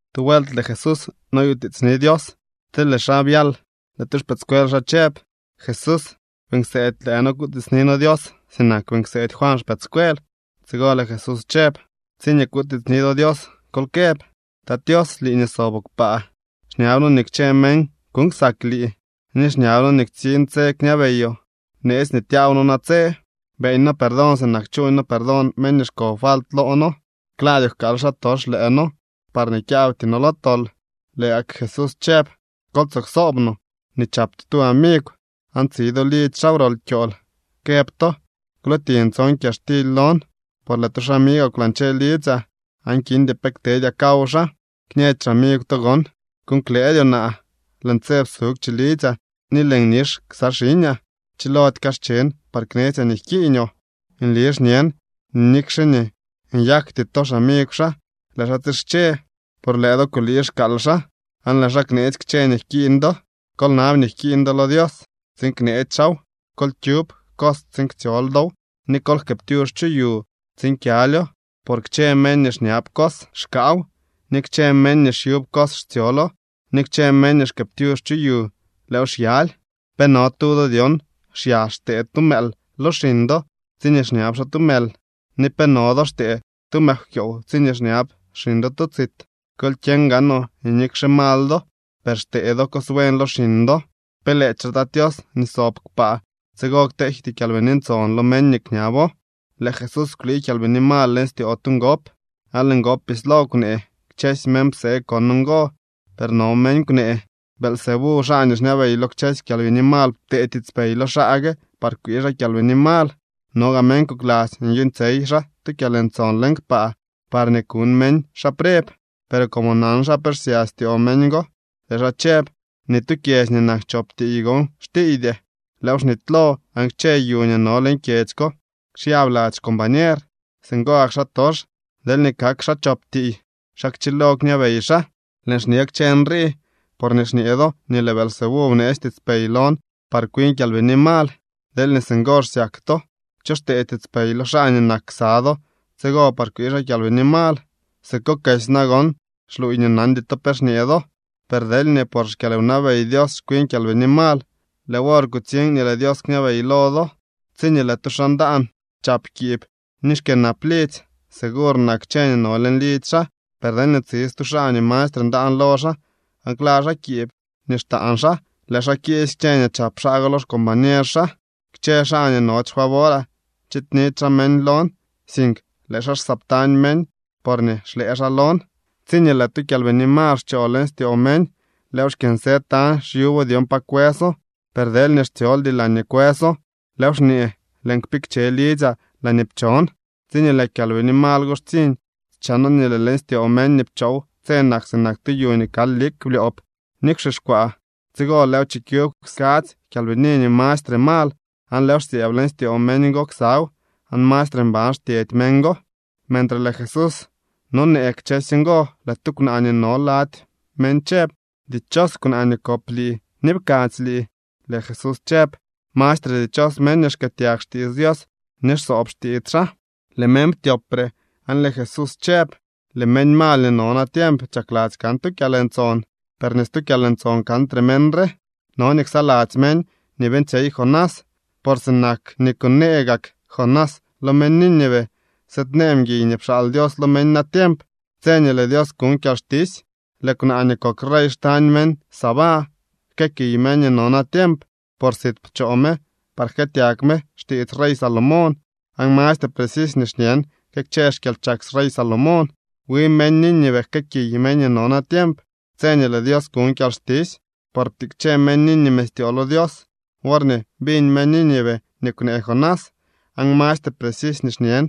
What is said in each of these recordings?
Tu vuelt lëë Jesús noyutiitsni Dios. Tsi lëë xaa byal, lëë tu xpëëdscuel xaa chëb: —Jesús, beeñ kseedy lëë noo kutiitsni noo Dios sinak beeñ kseedy Juan xpëëdscuel. Tsigo lëë Jesús chëb: —Tsiñee kutiitsni do Dios, kol këb: Tat Tios, lii nii soboo kpaa, xñab noo nii kchë meñ kuuñ ksak lii, ni xñab noo nii ktsiñ tse nii kñabeyoo. Bneetsy nii tyaaw noo natse. Beeñ noo perdón sinak chuuñ noo perdón meñ nii xko falt loo noo. Klaadyoo jkaal xaatox lëë noo parñee kyaabty noo lo tol. Lëë gak Jesús chëb: —Kol tsoo ksoob no nii chap to tu amigw, aan tsi do lidzy xaa wrol kyool, këb to: “Kwlootiñ tson kyaxtily lon, por lëë tu xamigwaa kwlañche lidzyaa, aan kindy pe ktedyaa kaw xaa.” Kñëdy xamigw to gon: “Kuuñ klëëdyoo naa. Lëën tse psugw chilidzyaa ni lëën nix ksa xiñaa. Chilody kaschen par pe knetsyaa nii jkiiñoo.” Nli xñen nii nikxe nii nyakty to xamigw xaa, lëë xaa tsische, por lëë do kulii xkaal xaa aan lëë xaa kneetsy kchë nii jkiiñ do. Kol nab nii jkiiñ do lo Dios tsiin kneetsy xaaw, kol kyub cos tsiin ktsyol dow, ni kol jkëëptyux chu yu tsiin kyalyo. Por kchë meñ nii xñab cos xkaaw, ni kchë meñ nii xyub cos xtsyolo, ni kchë meñ nii xkëëptyux chu yu lëëw xyaly. ’¿Pe no tu do dyon xyax xtee tu mëël lo xiñ do tsiñee xñab xaa tu mël? ¿Ni pe no do xtee tu mëkwkyoow tsiñee xñab xiñ do tu tsit? Kol kyeñ gaanoo nii nikxe mal do, per xtee do cos buen lo xiñ do. ¿Pe lëëdyxe Tat Tios nii sob kpaa tsigo kteejty Kyalbini Ntson lo meñ nii kñabo? Lëë Jesús kwlii kyalbini mal leñ styoo tu ngop, aan lëë ngop bislo kwnee. Kchësy meñ psee kon ngo, per no meñ kwnee: —Beelzebú, xaa nii xñabey lo kchësy kyalbini mal, ptee tiitspey lo xaa gue par kwii xaa kyalbini mal. No gaa meñ kokladzy nii nyuuñtsyey xaa tu kyalntson leñ kpaa parñee kuñ meñ xaa preb. Per como nan xaa pe xsya styoo meñ go, lëë xaa chëb: —Ni tu kyedzy nii nak chop tiiy gon xtiiydy. Lëëw xnitylo, aan kchë yu nii no leñ kyedzy ko xyab lady xcombañer. Singo gak xaatox deelñee kak xaa chop tiiy, ¿xa kchilo kñabey xaa? Lëën xñe kchë nrii porñee xñee do nii lëë Beelzebú bneetsy tiitspey lon par kwin kyalbini mal. Deelñee singo xsyak to, ¿cho xtee tiitspey lo xaa nii nak ksa do tsigo par kwii xaa kyalbini mal? Sikokesy nagon xluuy nii nandy to pe xñee do. Per deelñee por xkyalwnabey Dios xkwin kyalbini mal, lëë wor kutsiñ nii lëë Dios kñabey lo do. ’Tsiñee lëë tu xaa ndaan chap kiib ni xkyënap lidzy, segur nak kchë nii no leñ lidzy xaa. Per deelñee tsi stu xaa nii mastre ndaan lo xaa, aan kla xaa kiib nii xtaan xaa, lëë xaa kiisy kchë nii chap xaa go lo xcombañer xaa. ’Kchë xaa nii nody xfavoraa, chiidnidy xaa meñ lon, sink lëë xaa xsëëbtañ meñ, porñee xlëë xaa lon. ’Tsiñee lëë tu kyalbini mal xchoo leñ styoo meñ, lëëw xkyënsë tañ xyubo dyon pa kwëso. Per deelñee xtsyoldy laañee kwëso, lëëw xñee: “Lëën kpikche lidzyaa laañee pchon.” Tsiñee lëë kyalbini mal go xtsiñ, chano nii lëë leñ styoo meñ nii pchoow tse nak sinak tu yu nii kal lik blyoob ni kwxixkwaa. Tsigo lëëw chikyub skadzy kyalbini nii mastre mal, aan lëëw xsyëëb leñ styoo meñ go ksaw, aan mastre mban xtyedy meñ go. Mentre lëë Jesús nonee kchësy ngo, lëë tu kwnaa nii no lady meñ chëb: —¡Dichos kwnaa nii kop lii ni pkadzy lii! Lëë Jesús chëb: —¡Mastre dichos meñ nii xkëëtyag xtiits Dios, ni xsoob xtiits xaa! Lëë meñ ptyopre, aan lëë Jesús chëb: —Lëë meñ mal nii no natiemp chakladzy kan tu kyalntson, per ni stu kyalntson kantre meñ re. No nii ksaladzy meñ nii beeñtsyey Jonás. Por sinak nii kunee gak Jonás lo meñ Nínive, sëëdnee mguiy nii pxaal Dios lo meñ natiemp. Tse nii lëë Dios kuñ kyalxtisy lëë kwnaa nii kok rey xtañ meñ Sabá jkëëkiy meñ nii no natiemp, por sit pchoo me par jkëëtyag me xtiits rey Salomón, aan mastre precisy nii xñen que kchë xkyalchak rey Salomón. Wi meñ Nínive jkëëkiy meñ nii no natiemp tse nii lëë Dios kuñ kyalxtisy, por ptikche meñ Nínive styoo lo Dios worñee biñ meñ Nínive nii kwnee Jonás, aan mastre precisy nii xñen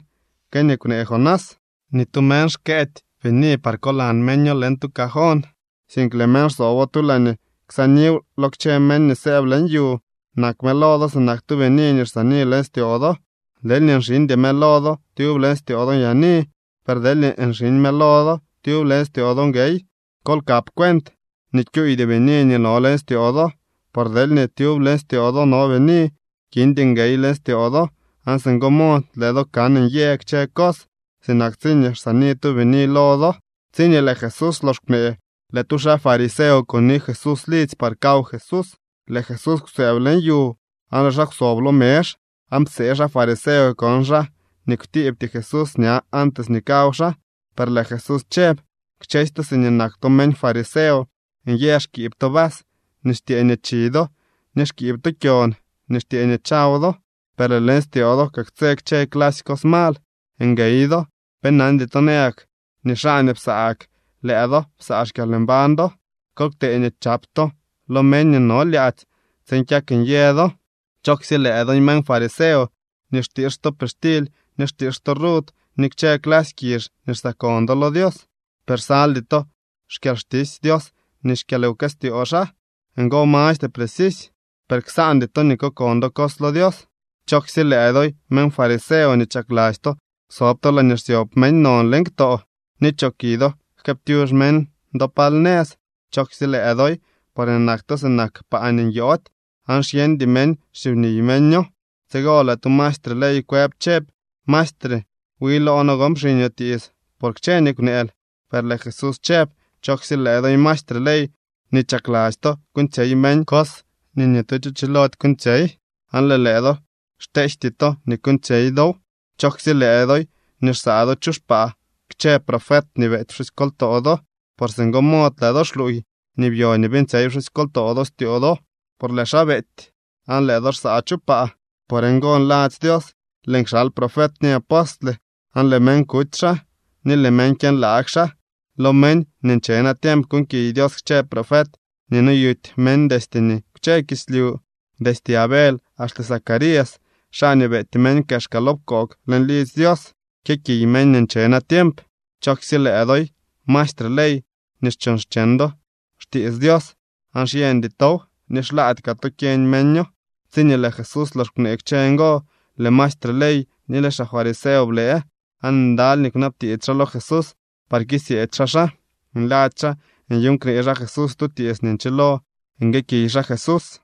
que nii kwnee Jonás. ’Ni tu meñ xkëëdy bini par kolan meño leñ tu cajón, sink lëë meñ xsoobo tu laañee ksaaniw lo kchë meñ nii sëëb leñ yu. Nak mëlo do sinak tu bini nii xsaani leñ styoo do. Deelñee nxiñdy mëlo do, tyub leñ styoo do nyaani. Per deelñee nxiñ mëlo do, tyub leñ styoo do nguey. Kol kap cuent nii kyuuydy bini nii no leñ styoo do. Por deelñee tyub leñ styoo do no bini, kindy nguey leñ styoo do, aan singo mod lëë do kan nyë kchë cos, sinak tsiñee xsaani tu bini lo do. Tsiñee lëë Jesús lox kwnee, lëë tu xaa fariseo kuni Jesús lidzy par kaw Jesús. Lëë Jesús kwsëëb leñ yu aan lëë xaa kwsob lo mezh. Aan psee xaa fariseo kon xaa nii kwtiibty Jesús ña antes nii kaw xaa. Per lëë Jesús chëb: —Kchësy to siñee nak to meñ fariseo nyë xkiib to vas nii xtyëë nii chi do, ni xkiib to kyon nii xtyëë nii chaw do, per lëë leñ styoo do kaktsë kchë clasy cos mal. ¡Nguey do! ¿Pe nandy to nayak nii xaa nii psaa gak lëë do psaa xkyalmbañ do? Kol ktee nii chap to lo meñ nii no lyaadzy tsiin kyak nyë do. ’¡Chooksye lëë doy, meñ fariseo nii xtiix to pixtily ni xtiix to rud ni kchë clasy kizh nii xsaakon do lo Dios, per xsaldy to xkyalxtisy Dios ni xkyalwkëstyoo xaa! Ngo mastre precisy, per ksaandy to nii kokon do cos lo Dios. ’¡Chooksye lëë doy, meñ fariseo nii chakladzy to sob to laañee xsyob meñ non leñ ktoo, ni choki do jkëëptyux meñ do pal nëz! ’¡Chooksye lëë doy!, porñee nak to sinak paa nii nyoody, aan xyeñdy meñ xsyub niy meño. Tsigo lëë tu maestre ley kwëb chëb: —Maestre, wi loo noo gon pxiñoo tiits por kchë nii kwneel. Per lëë Jesús chëb: —¡Chooksye lëë doy, maestre ley nii chakladzy to kuuñtsyey meñ cos nii ni tu cho chilody kuuñtsyey, aan lëë lëë do xteejty to nii kuuñtsyey dow! ’¡Chooksye lëë doy nii xsaa do chu xpaa kchë profet nii beety pxusykoltoo do! Por singo mod lëë do xluuy nii byo ni beeñtsyey pxusykoltoo do styoo do, por lëë xaa beety, aan lëë do xsaa chu paa. ’Por ngo nladzy Dios: “Lëën kxal profet ni apostle, aan lëë meñ kuty xaa, ni lëë meñ kyënlaag xaa.” Lo meñ nii nche natiemp kuuñkiy Dios kchë profet nii noyuty meñ destye nii kwche kislyu, destye Abel axte Zacarías, xaa nii beety meñ kexka lo pkoog leñ lidzy Dios. Kyëkiy meñ nii nche natiemp. ’¡Chooksye lëë doy, maestre ley nii chuuñ xcheñ do xtiits Dios, aan xyeñdy tow, ni xlaady kaa to kyeñ meño! Tsiñee lëë Jesús lox kwnee kchë ngo, lëë maestre ley ni lëë xaa fariseo blëë. Aan ndaly nii kwnabtiits xaa lo Jesús par kisyeedy xaa xaa. Nladzy xaa nyuuñ knee xaa Jesús tu tiits nii nchilo nguëëkiy xaa Jesús.